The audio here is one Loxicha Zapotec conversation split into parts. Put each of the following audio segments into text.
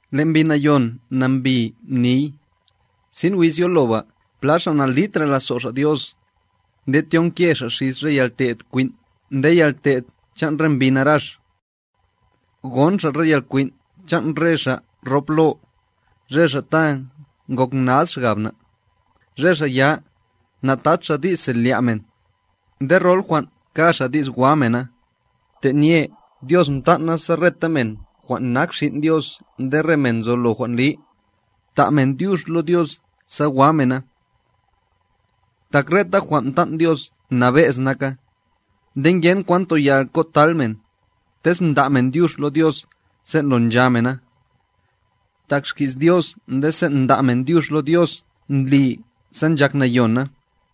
Le' Mbi Nayon nambi niy, sin wiz yoloba pla xa' na'litra' lazo' xa' Dios, nde tyonke xa' xis re yalte'd kwin' nde yalte'd chan' re mbi narax. Gon xa' re yalkwin' chan' re xa' rop lo, re xa' ta ngok nad xgab na, re xa' ya, natad xa' di's selya' men, nde rol jwan' ka xa' di's wa mena, tenye Dios mtan'na sa reta men jwan' nak xin' Dios nde re men nzolo jwan' li, ta' men dyux lo Dios sa wa mena. Tak reta jwan' mtan' Dios nabe'z naka, nde ngenkwan toyal kotal men, tez nda' men dyux lo Dios sen' lo ncha mena. Tak xki's Dios nde sen' nda' men dyux lo Dios ndli sa nchak nayon na.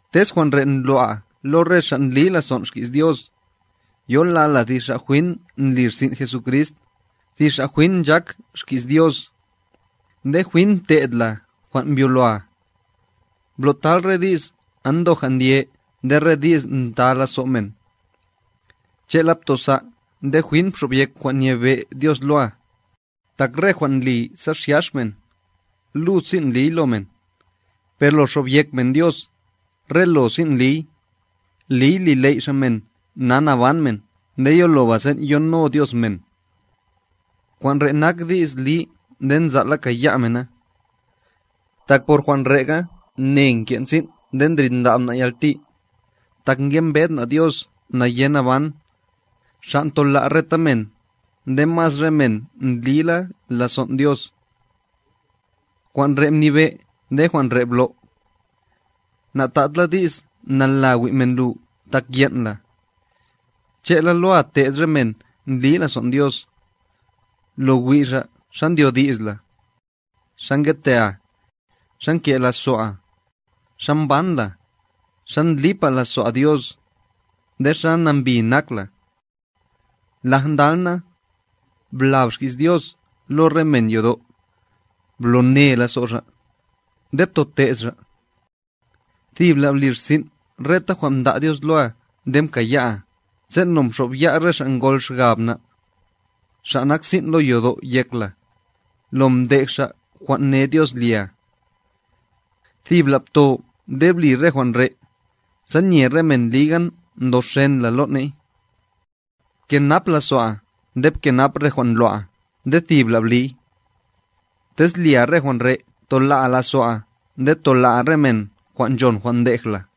Tez jwan' re' ndlo'a lo re xa' ndli lazon' xki's Dios, yolal la thi xa' jwin ndli rsin' Jesucrist, thi xa' jwin nchak xki's Dios, nde jwin mte'd la jwan' mbyoloa. Blo'tal re di's andoja' ndye nde re di's nta lazo' men. Che'la btosa' nde jwin bxobyek jwan' nyebe' Dios loa, tak re jwan' ndli sa xyax men, lud sin' ndliy lo men, per lo xobyek men Dios, re lo sin' ndliy, liy li ley' Xa' men na naban men nde yoloba sen' yono Dios men. Jwan' re' nak di's li nde nzal' la kaya' men na. Tak por jwan' re'ga ne nken' sin' nde ndrindab na' yalti, tak ngembed na' Dios nayenaban, Xa' ntola' reta men, nde mas re men ndlila lazon' Dios. Jwan' re' mnibe' nde jwan' re' blo'. Na'tad la di's nala wi' men lu tak yen' la, che'la loa te'd re men ndli lazo'n Dios, lo wi' xa' xa ndyodi's la, xa ngetea, xa nke' lazo'a, xa mban la, xa ndlipa' lazo'a Dios, nde xa nambi nak la. Laj ndal na, blab xki's Dios lo re men yodo', blo ne lazo' xa', nde btote'd xa'. Thibla' bli rsin' reta jwan' mda' Dios loa nde mkaya'a, sen' lo mxo'b ya' re xa' ngol xgab na', xa' nak sin' lo yodo' yek la, lo mdej xa' jwan' ne Dios lia. Thibla' bto nde bli re jwan' re', sa nye re men liga ndoxen la lo ne'y. Bkenap lazo'a nde bkenap re jwan' ndlo'a nde thibla' bliy. Tez lia re jwan' re' tola'a lazo'a nde tola'a re men jwan' nchon jwan' ndej la.